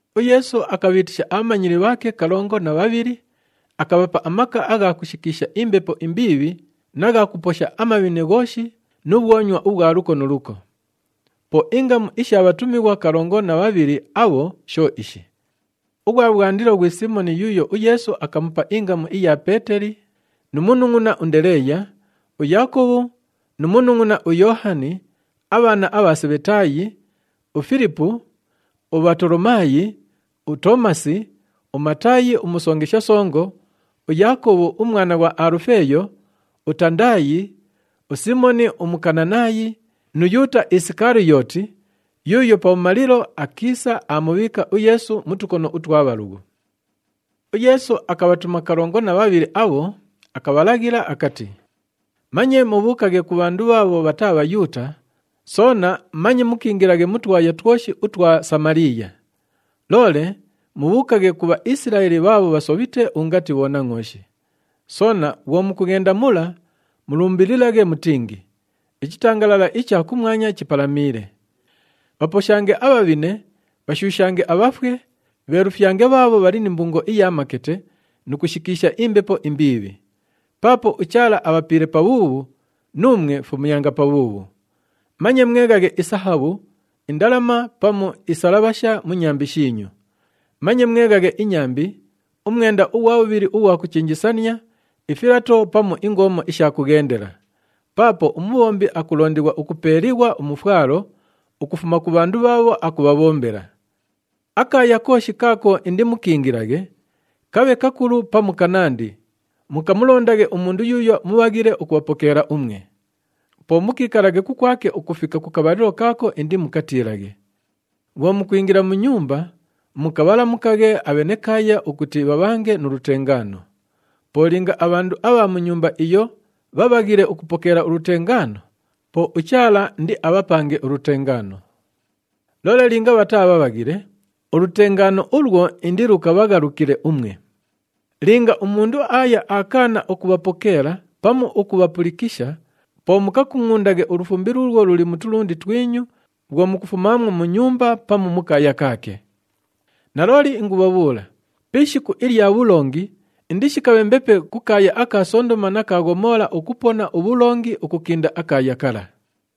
UYeesu akabhiitisha abhamanyili bhaake kalongo na bhabhili, akabhapa amaka agha kushikiisha imbepo imbiibhi na gha kuposha amabhine ghooshi nu bhwonywa ubhwa luko nu luko. Po ingamu isha bhatumighwa kalongo na bhabhili abho sho ishi, ughwa bhwandilo ghwi Siimoni yuuyo uYeesu akamupa ingamu iya Peeteli nu munungʼuna uNdeleeya, uYaakobhu nu munungʼuna uYoohani, abhaana abha Sebhetaayi, uFilipu, uBhatolomaayi, uToomasi, uMataayi umusongesha songo, uYaakobhu umwana ughwa Alufeeyo, uTandaayi, uSiimoni uMukananaayi nu Yuuta Isikaliyooti, yuuyo pabhumalilo akiisa aamubhiika uYeesu mu tukono utwa bhalughu. UYeesu akabhatuma kalongo na bhabhili abho, akabhalaghilila akati, “Manye mubhuukaghe ku bhandu bhaabho bhataa Bhayuuta, soona manye mukiingilaghe mu twaya twoshi utwa Samaliiya. Loole mubhuukaghe ku Bhaisilaeli bhaabho bhasobhite ungati bhonangʼooshi. Soona bhwo mukughenda mula, mulumbililaghe mutingi, ‘Ichitangalala icha kumwanya chipalamiile.’ Bhaposhange abhabhine, bhashuushange abhafwe, bheelufyange bhaabho bhali ni mbungo iya makete nu kushikiisha imbepo imbiibhi. Paapo uChaala abhapiile pabhuubhu, nuumwe fumyanga pabhuubhu. Manye mweghaghe isahabhu, indalama pamu isalabhasha mu nyambi shiinyu. Manye mweghaghe inyambi, umwenda ughwa bhubhili ughwa kuchenjesania, ifilato pamu ingoomo isha kughendela. Paapo umubhombi akulondighwa ukupeeliighwa umufwalo ukufuma ku bhandu bhaabho akubhabhombela. Akaaya kooshi kaako indimukiingilaghe, kabhe kakulu pamu kanandi, mukamulondaghe umundu yuuyo mubhaghile ukubhapokeela umwe. Po mukiikalaghe kukwake ukufika ku kabhalilo kaako indimukatiilaghe. Bhwo mukwingila mu nyumba, mukabhalamukaghe abhenekaaya ukuti bhabhange nu lutengaano. Po linga abhandu abha mu nyumba iyo bhabhaghile ukupokeela ulutengaano, po uChaala indiabhapange ulutengaano. Loole linga bhataa bhabhaghile, ulutengaano ulwo indilukabhaghalukile umwe. Linga umundu aaya akaana ukubhapokeela pamu ukubhapulikisha, po mukakungʼundaghe ulufumbi luulwo luli mu tulundi twinyu bhwo mukufumaamwo mu nyumba pamu mu kaaya kaake. Nalooli ingubhabhuula, pi ishiku ilya bhulongi indishikabhe mbepe ku kaaya aka Sondoma na ka Ghomoola ukupona ubhulongi ukukinda akaaya kala!”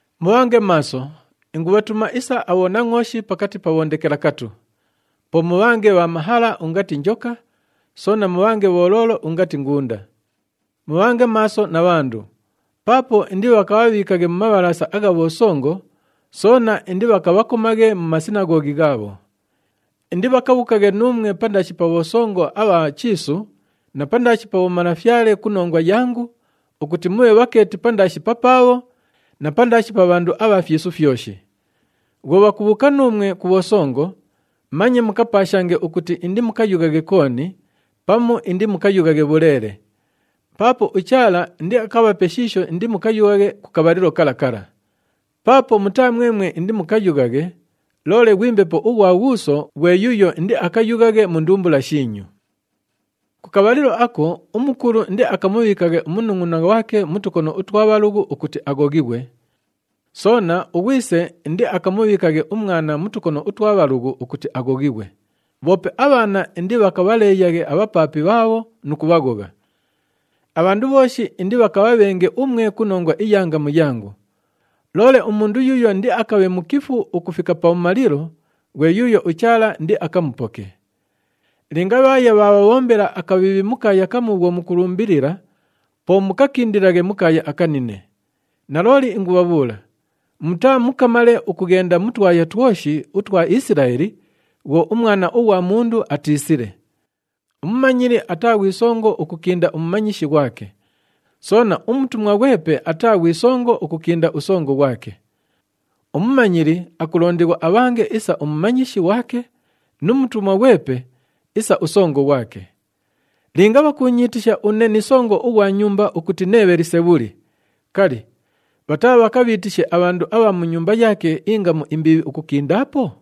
“Mubhange maaso, ingubhatuma isa abhonangʼooshi pakati pa bhondekelakatu. Po mubhange bha mahala ungati njoka, soona mubhange bholoolo ungati ngunda. Mubhange maaso na bhandu, paapo indibhakabhabhiikaghe mu mabhalaasa agha bhosongo, soona indibhakabhakomaghe mu masinaghoghi ghaabho. Indibhakabhuukaghe nuumwe pandaashi pa bhosongo abha chiisu na pandaashi pa bhomalafyale ku nongwa yangu ukuti mubhe bhakeeti pandaashi papaabho na pandaashi pa bhandu abha fyisu fyoshi. Bhwo bhakubhuuka nuumwe ku bhosongo, manye mukapaashange ukuti indimukayughaghe kooni, pamu indimukayughaghe bhuleele. Paapo uChaala indiakabhape shiisho indimukayughaghe ku kabhalilo kala kala. Paapo mutaa mwemwe indimukayughaghe, loole ghwi Mbepo ughwa Ghuuso ghwe yuuyo indiakayughaghe mu ndumbula shiinyu. “Ku kabhalilo ako, umukulu indiakamubhiikaghe umunungʼuna ghwake mu tukono utwa bhalughu ukuti aghoghighwe. Soona, ughwise indiakamubhiikaghe umwana mu tukono utwa bhalughu ukuti aghoghighwe. Bhoope abhaana indibhakabhaleeyaghe abhapaapi bhaabho nu kubhaghogha. Abhandu bhooshi indibhakabhabhenge umwe ku nongwa iya ngamu yangu. Loole umundu yuuyo indiakabhe mukifu ukufika pabhumalilo ghwe yuuyo uChaala indiakamupoke. Linga bhaaya bhaabhabhombela akabhiibhi mu kaaya kamu bhwo mukulumbilila, po mukakindilaghe mu kaaya akanine. Nalooli ingubhabhuula, mutaamukamale ukughenda mu twaya twoshi utwa Isilaeli bhwo uMwana ughwa Mundu atiisile. Umumanyili ataa ghwi songo ukukinda umumanyishi ghwake. Soona, umutumwa ghwepe ataa ghwi songo ukukinda usongo ghwake. Umumanyili akulondighwa abhange isa umumanyishi ghwake nu mutumwa ghwepe isa usongo ghwake. Linga bhakuunyiitisha une ni songo ughwa nyumba ukuti nee Bhelisebhuli, kali, bhataabhakabhiitishe abhandu abha mu nyumba yaake ingamu imbiibhi ukukindaapo?”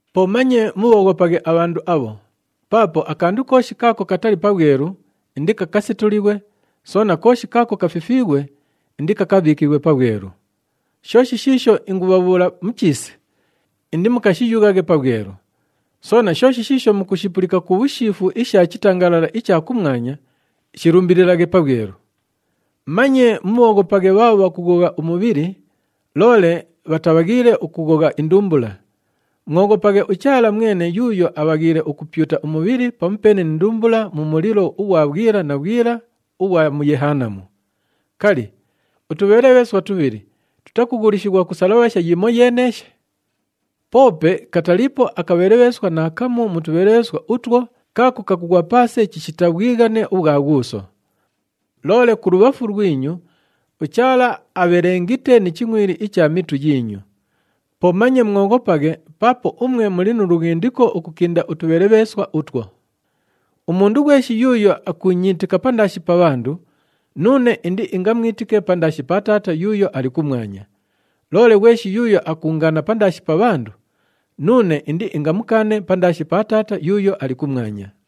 “Po manye mubhooghopaghe abhandu abho. Paapo akandu kooshi kaako katali pabhwelu, indikakasetulighwe, soona kooshi kaako kafifiighwe, indikakabhiikighwe pabhwelu. Shooshi shiisho ingubhabhuula mu chiisi, indimukashiyughaghe pabhwelu. Soona shooshi shiisho mukushipulika ku bhushiifu isha chitangalala icha kumwanya, shilumbililaghe pabhwelu. Manye mubhooghopaghe bhaabho bhakughogha umubhili, loole bhatabhaghiile ukughogha indumbula. Mwoghopaghe uChaala mwene yuuyo abhaghiile ukupyuta umubhili pamupeene ni ndumbula mu mulilo ughwa bhwila na bhwila ughwa mu Yehanamu. Kali, utubhelebheeswa tubhili tutakughulishighwa ku salabhasha yimoyeeneeshe? Poope kataliipo akabhelebheeswa naakamu mu tubhelebheeswa utwo kaako kakughwa paase chishita bhwighane ubhwa Ghuuso. Loole kulubhafu lwinyu, uChaala abhelengite ni chingʼwili icha mitu yiinyu. Po manye mwoghopaghe paapo umwe muli nu lughindiko ukukinda utubhelebheeswa utwo. Umundu ghweshi yuuyo akuunyiitika pandaashi pa bhandu, nuune indiingamwitike pandaashi pa Taata yuuyo ali kumwanya. Loole ghweshi yuuyo akuungaana pandaashi pa bhandu, nuune indiingamukaane pandaashi pa Taata yuuyo ali kumwanya.”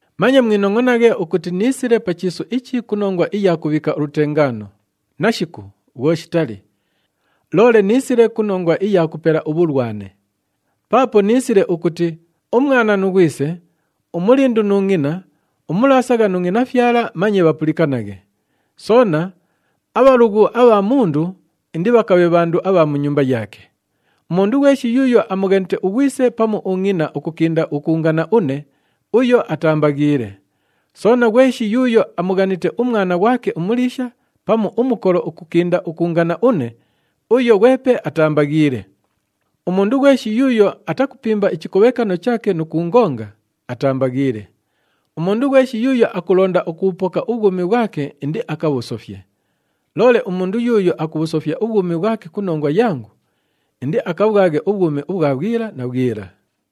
“Manye mwinongʼonaghe ukuti niisile pa chiisu ichi ku nongwa iya kubhiika ulutengaano. Nashiku! Bhwo shitali. Loole niisile ku nongwa iya kupela ubhulwane. Paapo niisile ukuti umwana nu ghwise, umulindu nu ngʼina, umulaasagha nu ngʼinafyala manye bhapulikanaghe. Soona, abhalughu abha mundu indibhakabhe bhandu abha mu nyumba yaake. Umundu ghweshi yuuyo amughanite ughwise pamu ungʼina ukukinda ukuungana une, uyo ataambaghiile. Soona, ghweshi yuuyo amughanite umwana ghwake umuliisha pamu umukolo ukukinda ukuungana une, uyo ghwepe ataambaghiile. Umundu ghweshi yuuyo atakupimba ichikobhekano chaake nu kuungonga, ataambaghiile. Umundu ghweshi yuuyo ukulonda ukubhupoka ubhwumi bhwake, indiakabhusofye. Loole umundu yuuyo akubhusofya ubhwumi bhwake ku nongwa yangu, indiakabhwaghe ubhwumi ubhwa bhwila na bhwila.”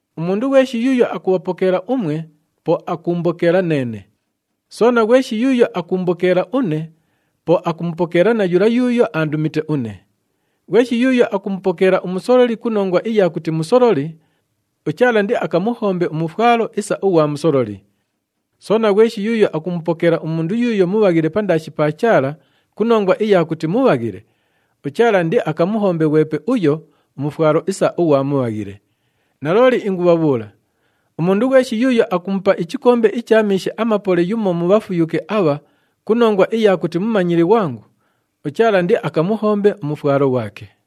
“Umundu ghweshi yuuyo akubhapokeela umwe, po akuumbokeela neene. Soona, ghweshi yuuyo akuumbokeela une, po akumupokeela na yula yuuyo aandumite une. Ghweshi yuuyo akumupokeela umusololi ku nongwa iya kuti musololi, uChaala indiakamuhombe umufwalo isa ughwa musololi. Soona, ghweshi yuuyo akumupokeela umundu yuuyo mubhaghile pandaashi pa Chaala ku nongwa iya kuti mubhaghile, uChaala indiakamuhombe ghwepe uyo umufwalo isa ughwa mubhaghile. Nalooli ingubhabhuula, umundu ghweshi yuuyo akumupa ichikombe icha miishi amapole yumo mu bhafuyuke abha ku nongwa iya kuti mumanyili ghwangu, uChaala indiakamuhombe umufwalo ghwake.”